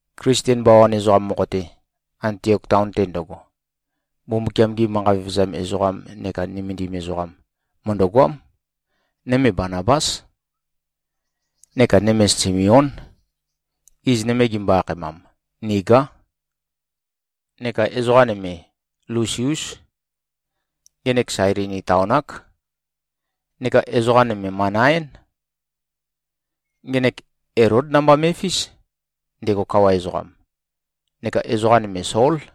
Klisten bawan ezoqam mokho-te, Antiok taon-te ndøgo, Mbumbukiam-gi manqa vevezam ezoqam neka nømendim ezoqam, mø̀ndøgoám. Nøme Banabás. Neka nøme Simeón. Iz nøme gimbo-akhaemam, Nigá. Neka ezoqa nøme Lusiús. Ngenek Sailini taon-ák. Neka ezoqa nøme Manaén. Ngenek Elód namba me꞉fís, ndego kawa ezoqam. Neka ezoqa nøme Sól.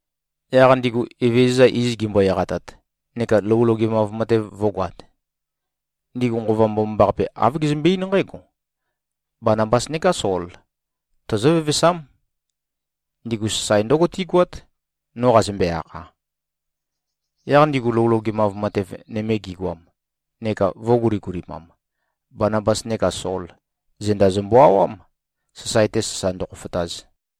Yaq ndigu Evezøza iz gimbo-eqatat neka lou logemav matev vø̄goat, ndigu Nqova Mbomambaqape, āv gezømbe-eín nqǽgo, “Banabas neká Sol, tozó-vevesám. Ndigu sasae ndǿgo tígoát, no qazømbe-akha.” Yaq ndigu lou logemav matev nøme gigoam neka vø̄guligulimam, Banabas neka Sol, zenda zømbø-awám, sasae-te sasa ndøkhofotaz.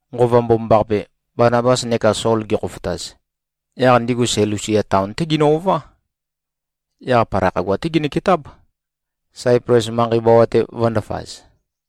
Nqova Mbomambaqape, Banabas neka Sol gekhofotaz, yaq ndigu Selusia taon-té ginø-ová. Yaq palai khagua-té ginøketáb, Saiples manqei bawa-te vø̄ndafaz.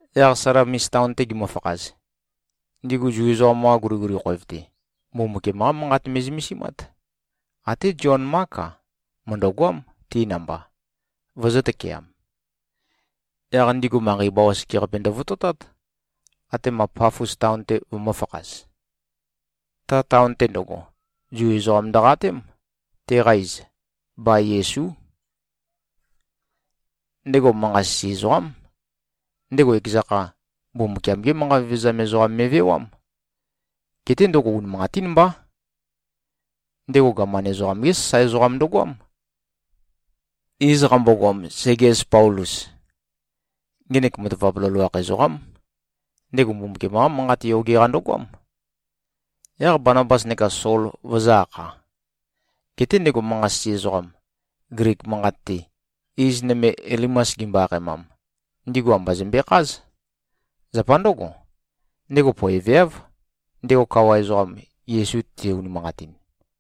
Yaq Salamis taon-te gimøfakhaz, ndigu Zu ezoqam-qa guliguli khoev-te, Mbumbukiam-qá Manqat me꞉zømesimát. Até Zion-Mák-a, mø̀ndøgoám, ti namba, vøzø̄-tøkeam. Yaq ndigu manqei bawa sekeqape ndøvototát, atema Pafos taon-te vømø̄fakhaz. Ta taon-te ndøgo, Zu ezoqam ndøqatém. Teqa iz, Ba-Yesú. Ndego manqa-sisi ezoqám. Ndego ekeza kha, Mbumbukiam-gé manqa vevezam ezoqam me꞉vewám. Geté ndøgo unimanqatín mbá. Ndego gaman ezoqam-gé sasae ezoqam ndøgoám, iz qambogoam Segies Paulus. Ngenek matavap loloakh ezoqám. Ndego Mbumbukiam-qá Manqat yoge-qa ndøgoám, yaq Banabas neka Sol vøzø̄-akha. Geté ndego manqa-sisi ezoqam, Glik manqat-te, iz nøme Elimas gimbo-akhaemam, ndigu amba zømbekház. Zapa ndǿgo, ndego poeveáv, ndego kawa ezoqam, Yesu te-unimanqatin.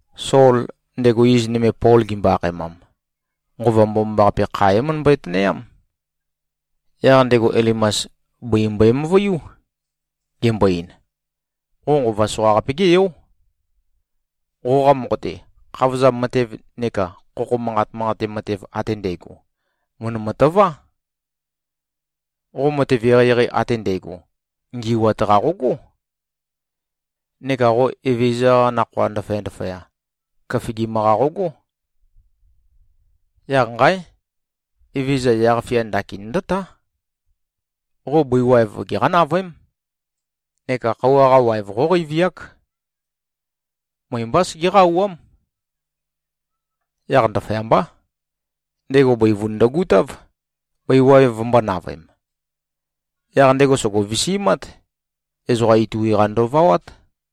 Sol, ndego iz nøme Pol gimbo-akhaemam, Nqova Mbomambaqape kha é-møndømbøi-tønøyám. Yaq ndego Elimas, bøi mbøe-møvuiú, gembo-ein, “Qo nqova soqaqape-gé yó. Qoqa mokho-te, khavozam matev neka khokho manqa manqate matev ate ndægo mø̀ndømø-tøvá. Qo matev eqeieqei ate ndægo ngi꞉wat-qa qogó. Neka qo Evezøza-qa nakhoa ndaføya-ndaføya, køfigim-qa qogó. Yaq nqáe! Evezøza yaq-fia ndakin ndǿtá. Qo bøi waev geqá-navøém, neka khøuwa-qa waev qóqeiviák. Møe-mbá segeqá-auwám.” Yaq ndaføyambá, ndego bøivun ndøgutáv, bøi waev vømbō-navøem. Yaq ndego sògo-visimát. Ezoqa itui-qa ndøvawát.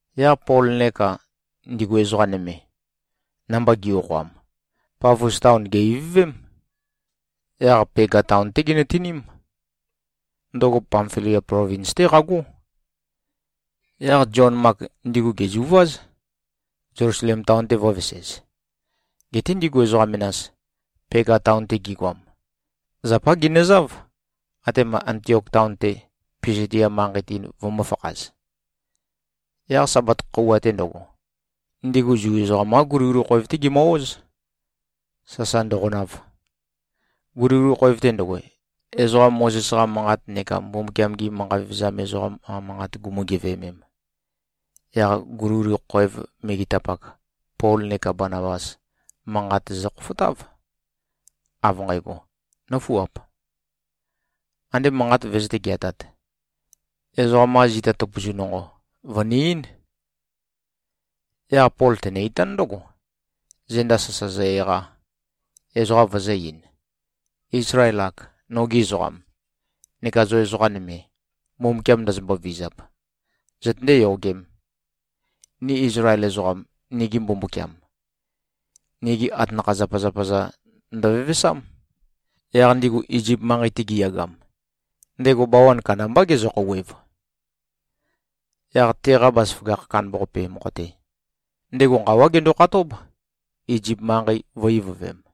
Yaq Pol neka ndigu ezoqa nøme, namba gi꞉-okhoam, Pafos taon gè-ivøvém. Yaq Pega taon-té ginøtiním. Ndøgo Pamfilia plovins-té qagó. Yaq Zion-Mak ndigu gèzuváz, Zelusalem taon-te vø̄vesez. Geté ndigu ezoqa menas, Pega taon-te gigoam, zapá ginøzáv, atema Antiok taon-te, Pisidia manqei-te, vømø̄fakhaz. Yaq Sabat khøuwa-te ndøgo, ndigu Zu ezoqam-qa guliguli khoev-té gimø-óz, sasa ndøqonav. Guliguli khoev-te ndøgo, ezoqa Mozes-qa manqat neka Mbumbukiam-gi manqa vevezam ezoqam-qa manqat gumu-geveømem, yaq guliguli khoev megetapak, Pol neka Banabas manqat zøkhofotáv, av nqægo, “Nǿfuap. Andé manqat vøzøté-geatāt, ezoqam-qa zita tøpøzu nonqo, vø̀ni-eín.” Yaq Pol tenø-itán ndǿgo, zenda sasa zø-eqa, ezoqa vøzø̄-ein, “Izlael-ak, nogi ezoqam, neka zo ezoqa nøme, Mbumbukiam ndozombo-vizap, zøtøndé-yogēm. Ni Izlael ezoqam, nigi Mbumbukiam, nigi atanakha-zapazapa-za ndøvevesám. Yaq ndigu Izip manqei-te giyagam, ndego bawan kandambá gezø-khouwev. Yaq teqa bazaføgakh kandambaqape mokho-te, ndego nqawá gendo-khatób, Izip manqei vø̄-ivøvem.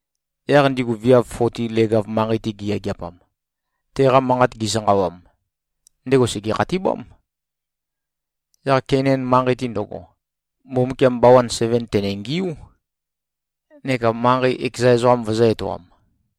Yaq ndigu viav foti leg-av manqei-te giyageapam, teqa manqat gisanqawam, ndego sège-khatibám. Yaq Keinan manqei-te ndøgo, Mbumbukiam bawan seven tènengiú, neka manqei ekeza ezoqam vøzø̄-etoam.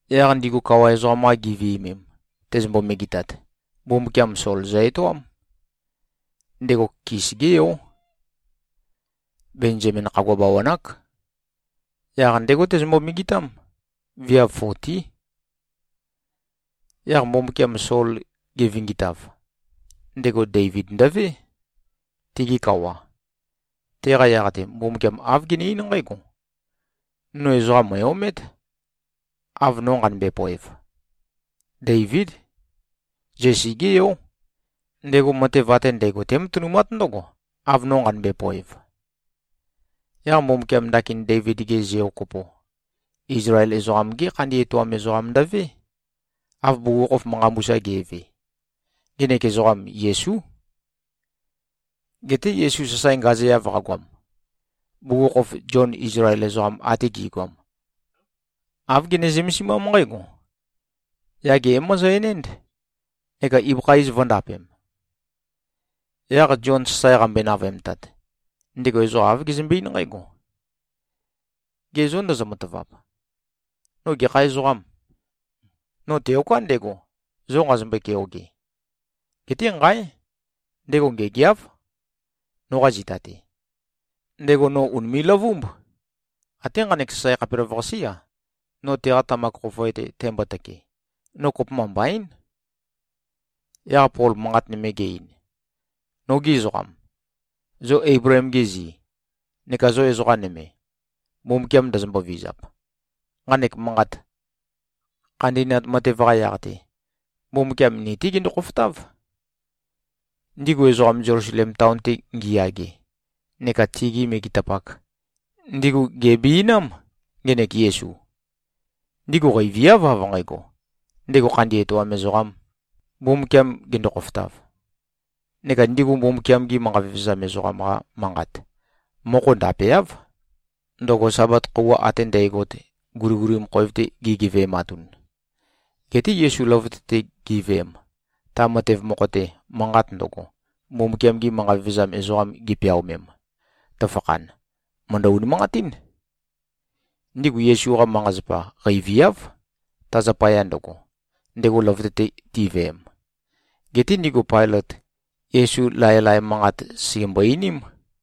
Yaq ndigu kawa ezoqam-qa giviømem, tezømbo-megetat, Mbumbukiam Sol zø-etoám. Ndego Kis-gé yó. Benzamin khagua bawan-ák. Yaq ndégo tezømbo-megetám. Viav fotí. Yaq Mbumbukiam Sol gevingitav, ndego Deivid ndøvé, tigi kawa. Teqa yaq-te, Mbumbukiam āv gene-eín nqǽgo, ‘No ezoqam mø̀e-omét, av no nqanømbe-poev. Deivíd. Zesi-gé yó. Ndego matev ate ndægo tématønumát ndǿgo, av no nqanømbe-poev.’ Yaq Mbumbukiam ndakin Deivid-ge zeo kopo, Izlael ezoqam-gé khandi etoam ezoqam ndøvé, av bugukhokhof manqa mbusa ge꞉ve. Ngenek ezoqam, Yesú. Geté Yesu sasae ngazeav qagoam, bugukhokhof Zion Izlael ezoqam ate gi꞉goam, āv gene-zømesimám nqǽgo, ‘Yage é-mozo-enénd neka ibøkha iz vø̄ndapem.’ Yaq Zion sasae qambøe-navøemtat, ndego ezoqa āv gezømbe-eín nqǽgo, ‘Ge zô, ndozo-matavap, no gekha ezoqâm? No teoká ndego, zo nqazombøe-keoge. Geté nqáe! Ndego ngêgeáv, noqa zita-te. Ndego no ùnime꞉-løvúmb. Até nqanek sasae khapelavøqasé-a, no teqa tamak khofoe-te tæmbotøke, no kopømba mbaín.’” Yaq Pol manqat nøme ge-ein, “Nógi ezoqam, zo Eibleem-gi zi, neka zo ezoqa nøme, Mbumbukiam ndozombo-vizap! Nqanek manqat, khandi꞉nat matev-qa yaq-te, Mbumbukiam ni-té gendo-khofotáv. Ndigu ezoqam, Zelusalem taon-te ngiyage neka tigi megetapak, ndigu gèbiinám, ngenek Yesu. Ndigu qeiviáv, av nqægo, ndego khandi etoam ezoqām, Mbumbukiam gendo-khofotav. Neka ndigu Mbumbukiam-gi manqa vevezam ezoqam-qa manqat mokho ndapeáv, ndøgo Sabat khøuwa ate ndægot, guliguli khoev-te gigeve꞉matun. Geté Yesu løvøte-te giveem, ta matev mokho-te, manqat ndøgo, Mbumbukiam-gi manqa vevezam ezoqam gipeaomem, tøfakhan, mø̀ndø-unimanqatín. Ndigu Yesu-qa manqa-zapa qeiviáv, ta zapaya ndøgo, ndego løvøte-te tiveem. Geté ndigu Pailøt, Yesu laelae manqat sègembo-einím.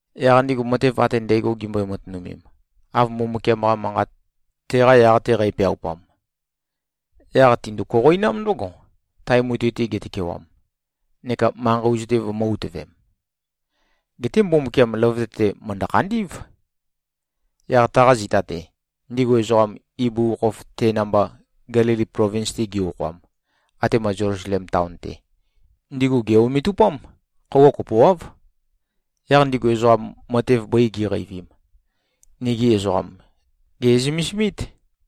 Yaq ndigu matev ate ndægo gimbøi-matønømem, av Mbumbukiam-qa Manqat teqa yaq-te qæpeaupam, yaq tindu-koqoinám ndǿgo, tae mutui-te getøkewam, neka manqei ozu-te vømø̄-utøvem. Geté Mbumbukiam løvøte-te mø̀ndø-khandí꞉v. Yaq taqa zita-te, ndigu ezoqam, ibugukhokhof te namba Gelili plovins-te gi-okhoam, atema Zelusalem taon-te, ndigu gè-ometupám. Khøuwa kopoáv. Yaq ndigu ezoqam, matev bøi gi꞉qeivim, nigi ezoqam gè꞉zømesimít.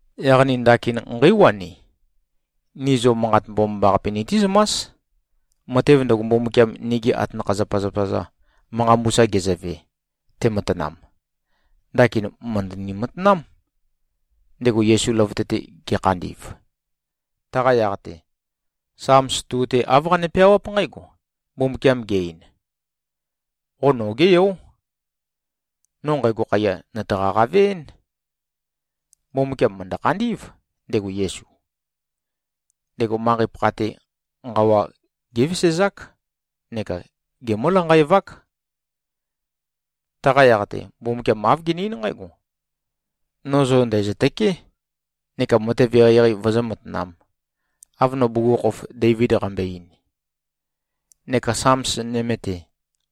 Yaq ni ndakin nqéiwani. Ni zo Manqat Mbomambaqape nitízømás. Matev ndøgo, Mbumbukiam nigi atanakha-zapazapa-za manqa mbusa gezøve, tematanam, ndakin mø̀ndøni-matanám, ndego Yesu løvøte-te ge꞉khandi꞉v. Taqa yaq-te, Sams 2-te āv qane-peawáp nqǽgo: Mbumbukiam ge-ein, ‘Qo nogé yó. No nqægo khaiya, nø̀taqa-qave-én.’ Mbumbukiam mø̀ndø-khandí꞉v, ndego Yesu. Ndego manqei-pakha-te nqawa gévesezák neka gemǿ-lanqaevák. Taqa yaq-te, Mbumbukiam āv gene-eín nqǽgo, ‘No zo ndæ̀zøtøké, neka matev eqeieqei vøzǿ-matanām, av no bugukhokhof Deivid qambøe-ein.’ Neka Sams nøme-te,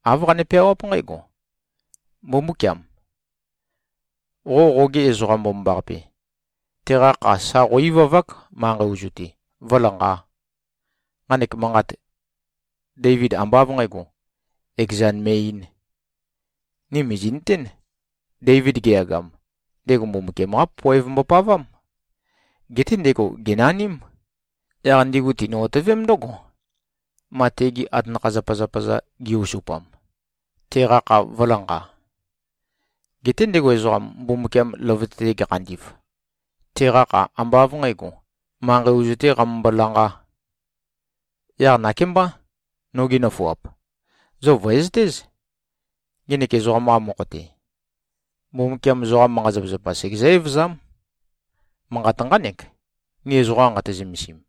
āv qane-peawáp nqǽgo, ‘Mbumbúkiam! Qo qoge Ezoqam Mbomambaqape, teqa kha, sa qó-ivavák, manqei ozu-te vǿlanqā.’ Nqanek manqat, Deivid ambá av nqǣgo, ekezan me꞉-eīn. Ni mìzi꞉nøtén, Deivid geyagam, ndego Mbumbukiam-qá poev mbopavám. Geté ndego gènaním. Yaq ndigu tinø-otøvém ndǿgo, ma tegi atanakha-zapazapa-za gi-osupam, teqa kha vø̄lanqa. Geté ndego ezoqam, Mbumbukiam løvøte-te gekhandi꞉v, teqa kha ambá av nqǣgo, manqei ozu-tē qamømbo-lanqā. Yaq nakémbá, nogi nøfuap. Zo vø̀ezøtéz. Ngenek ezoqam-qa mokho-te, Mbumbukiam zoqa manqa-zapazapa segezǿ-evøzám. Manqat nqánek, ni ezoqa nqati-zømesim.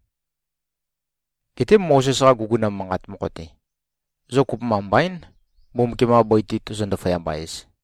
Geté Mozes-qa guguna manqat mokho-te, zo kopømba mbaín, Mbumbukiam-qa bøi-te tozo-ndaføyamba-ez.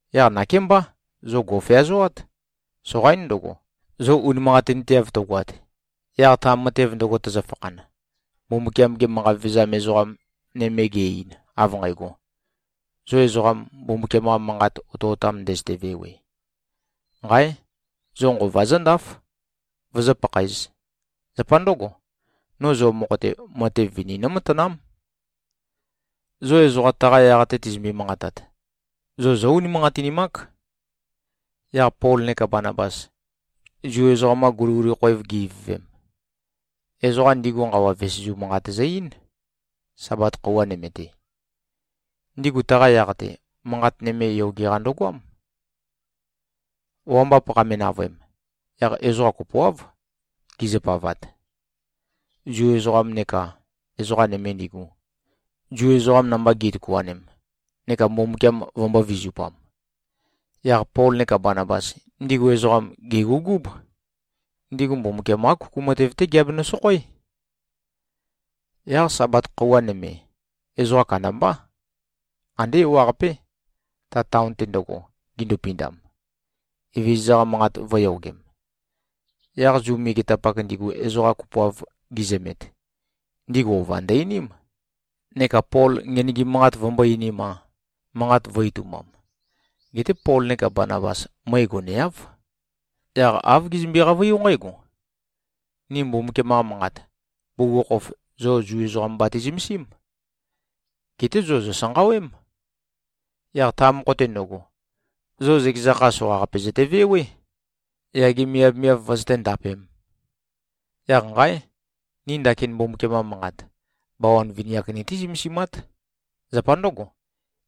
Yaq nakémbá, zo gò꞉feazoát! Soqaín ndøgo, zo unimanqatinteav tøgoat, yaq ta matev ndøgo tøzøfakhan, Mbumbukiam-ge manqa vevezam ezoqam nøme ge꞉-ein, av nqægo, ‘Zo ezoqam, Mbumbukiam-qa Manqat otøotam ndøzøte-vewe! Nqáe! Zo nqova zǿndáf, vozó-pakhaēz. Zapa ndǿgo, no zo mokho-te, matev vini nǿmatanám. Zo ezoqa taqa yaq-te tizømbe-manqatat, zo zó-unimanqatinimák.’” Yaq Pol neka Banabas, Zu ezoqam-qa guliguli khoev gi-ivøvem, ezoqa ndigu nqawa vesezu manqat zø-eín, Sabat khøuwa nøme-te. Ndigu taqa yaq-te, manqat nøme yoge-qa ndøgoám. Wambap qame-navøem, yaq ezoqa kopoáv gizø-pavat, Zu ezoqam neka ezoqa nøme ndigu, Zu ezoqam namba gi꞉tøkuanem neka Mbumbukiam vømbō-vizupam. Yaq Pol neka Banabas, ndigu ezoqam, gègugúb. Ndigu Mbumbukiam-qá kuku matev-té giabenø-sokhoé. Yaq Sabat khøuwa nøme, ezoqa kandambá, andé ewaqapé, ta taon-te ndøgo, gindupindam, Evezøza-qa Manqat vø̄yogem. Yaq Zu megetapak ndigu ezoqa kopoav gizømet, ndigu ova ndø-einím, neka Pol ngenøgim manqat vømbō-einim-a, manqat vø̄-itumbam. Geté Pol neka Banabas møe goneáv. Yaq āv gezømbe-qavøiú nqǽgo, “Ni Mbumbukiam-qa Manqat, bugukhokhof zo Zu ezoqam bati-zømesím. Geté zo zòsanqawém. Yaq ta mokho-te ndøgo, zo zøkeza kha soqaqape zøtevewé, yage miavmiav vøzøté-ndapēm. Yaq nqáe! Ni ndakin Mbumbukiam-qa Manqat, bawan vini-ak nití-zømesimát. Zapa ndǿgo,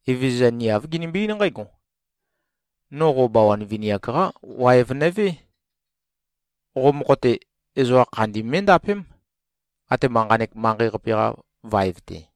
Evezøza ni āv ginimbi-eín nqǽgo, ‘No qo bawan vini-ak-qá waev nøvé. Qo mokho-te, ezoqa khandi mé꞉ndapém, atema nqanek manqei-qape-qa vaev-te.’”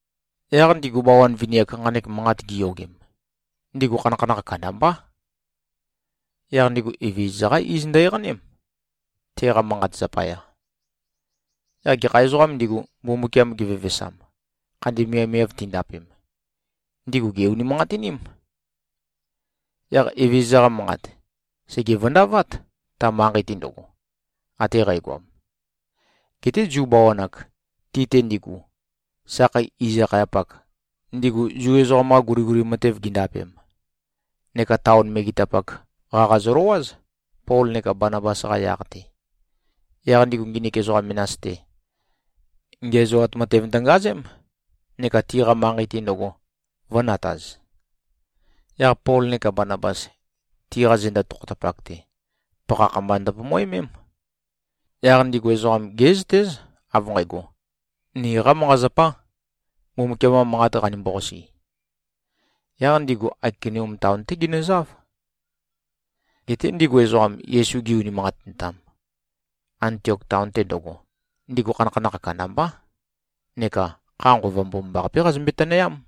Yaq ndigu bawan vini-ak, nqanek manqat giyogem, ndigu khanakhanakh kandambá. Yaq ndigu Evezøza-qá iz ndø-eqaném, teqa manqat zapaya. Yaq gekha ezoqām ndigu, Mbumbukiam gevevesam, khandi miavmiav tindapem, ndigu gè-unimanqatiním. Yaq Evezøza-qa Manqat, sège-vøndavát, ta manqei-te ndøgo, ate qægoam. Geté Zu bawan-ak, ti-te ndigu, sakhei iz-akhayapak, ndigu Zu ezoqam-qa guliguli matev gindapem, neka taon megetapak, qaqa zøløwáz, Pol neka Banabas-qa yaq-te. Yaq ndigu, nginik ezoqa menas-te, ngiæzoat matev ndøngazém, neka tiqa manqei-te ndøgo vø̄nataz. Yaq Pol neka Banabas, tiqa zenda tokhotapak-te, pakhakh mba ndøpomoemém. Yaq ndigu ezoqam gé꞉zøtéz, av nqægo, niqā manqa-zapā, Mbumbukiam-qa Manqat qanimbo-qasi. Yaq ndigu Aikonium taon-té ginøzáv. Geté ndigu ezoqam, Yesu gi-unimanqatintam, Antiok taon-te ndøgo, ndigu khanakhanakh kandambá neka kha Nqova Mbomambaqapé qazømbe-tønøyám.